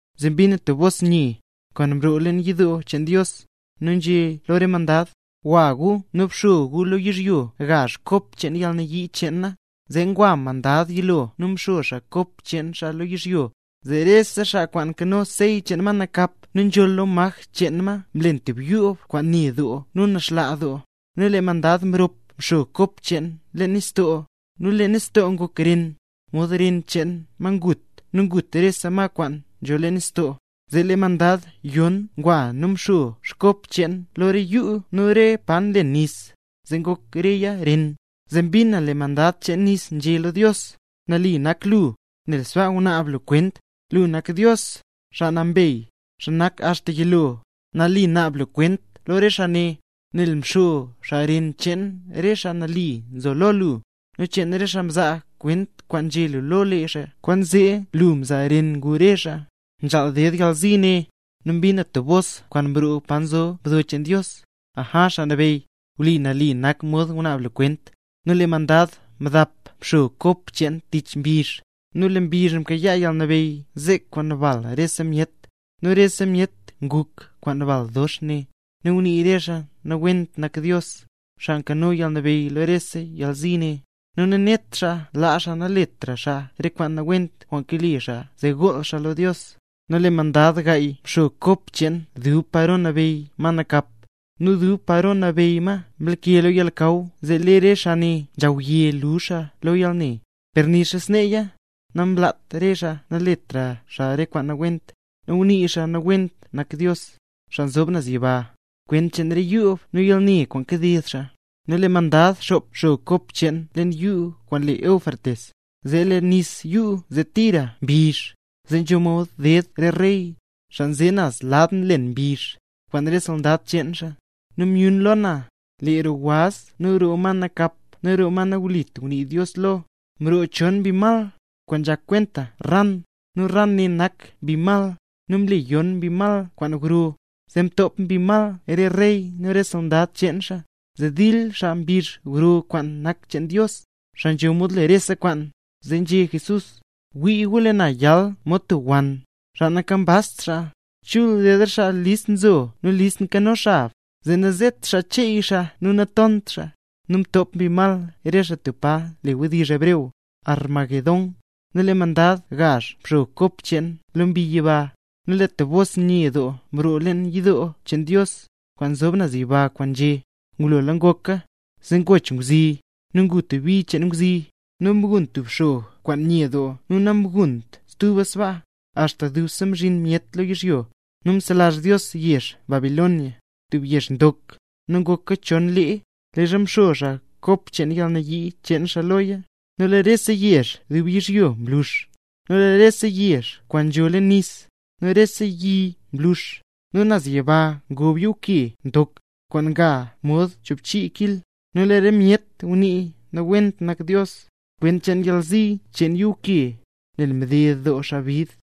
Zee mbin na tub bos nye, kwaan nroo leen yidoo cheen Dios, nu nzhé lo re mandad: —Gwa gu nu bxo gu lo yizhyo gazh kop cheen yalnayii cheen na. Zee ngwa mandad yilo nu mxo xaa kop cheen xaa lo yizhyo, zee rese xaa kwaan nkano sey cheen ma nakap nu nzholl lo maj cheen ma, mlen tub yoob kwaan ne doo nu nlaxlaa doo. Nu lee mandad mrop mxo kop cheen leen nistoo, zee lee nistoo ngok ren, mod ren cheen xaa ngut nu ngut rese ma kwaan nzho leen nistoo. Zee lee mandad yon ngwa nu mxo kop cheen lo re yuu nu re pa nlen nis, zee ngok reya ren. Zee mbin na lee mandad cheen nis nzhé lo Dios: —Nali nak lu, nel sbaa ngunaab lu kwent; lu nak Dios, xaa nambey, xaa nak axta yilo, nali naab lu kwent lo re xaa ne, nel mxo xaa ren cheen re xaa mle nambey Jesús, nu cheen re xaa mzaa kwent kwaan nzhé lu lo lee xaa, kwaanzee lu mzaa ren ngu re xaa. ¡Nzhaal ded yalzi ne! Nu mbin na stub bos kwaan mroo pa nzo mdo cheen Dios: —Aja, Xaa Nabeyy, wli nu nali nak mod ngunaab lu kwent. Nu lee mandad mdap mxo kop cheen tich mbizh; nu lee mbizh mkayaa yalnabeyy zek kwaan bal rese myet. Nu rese myet nguk kwaan bal dox ne; nu ngunii re xaa nawent nak Dios, xaa nkano yalnabeyy lo rese yalzi ne; nu nanet xaa laa xaa naletra xaa re kwaan nawent kwaan kale xaa zee gool xaa lo Dios. Nu lee mandad gaay mxo kop cheen dub paro nabeyy ma nakap, nu dub paro nabeyy ma mlake lo yalnakaw zee lee re xaa nzhawye luzh xaa lo yalne; per nixa sneeya, namlaat xaa naletra xaa re kwaan nawent; nu ngunii xaa nawent nak Dios, xaa nzob naz yiba, kwent cheen re yoob nu yalne kwaan kaded xaa. Nu lee mandad xop mxo kop cheen leen yuu kwaan le Éufrates; zee lee nis yuu zee tira mbizh, zee nzho mod ded re rey, xaa nze naz lad nlen mbizh, kwaan re soldad cheen xaa. Nu myun lo na, lee roo waz nu roo ma nakap nu roo ma nawlit ngunii Dios lo, mroo chon mbi mal, kwaan nzhak kwenta ran. Nu ran ne nak mbi mal, nu mle yon mbi mal kwaan gro, zee top mbi mal re rey nu re soldad cheen xaa, zee dil xaa mbizh gro kwaan nak cheen Dios, xaa nzho mod le rese kwaan. Zee nzhé Jesús: —Wii gu lee na yal mod tub wann, xaa nankambazt xaa. Chul ded re xaa kwaan list nzo nu listla nkano xab, zee nazet xaa cheey zee natont xaa. Nu mtop mbi mal re xaa tub pa le wdizh hebreo Armagedón. Nu lee mandad gazh mxo kop cheen lo mbi yiba; nu lee tub bos nye nii mroo leen yidoo cheen Dios, kwaan nzob naz yiba, kwaan nzhé: —¡Ngulola ngoka! Zee ngoch ngwzi, nu ngu bi cheen ngwzi; nu mgun tub xog kwaan nye doo nu namgunt stuba sbaa, axta dubse nzhi myet lo yizhyo. Nu mselazh Dios yezh Babilonia, tub yezh ndok, nu ngoka chon leeya, leezha mxo xaa kop cheen yalnayii cheen xaa loya; nu lee rese yezh dub yizhyo mlux. Nu lee rese yezh kwaan nzho leen nis, nu rese yi mlux, nu naz yiba ngob yuuke ndok, kwaan nga mod choobchii kil, nu lee re myet ngunii nawent nak Dios, kwent cheen yalzi cheen yuuke, nel mded doo xaa bid.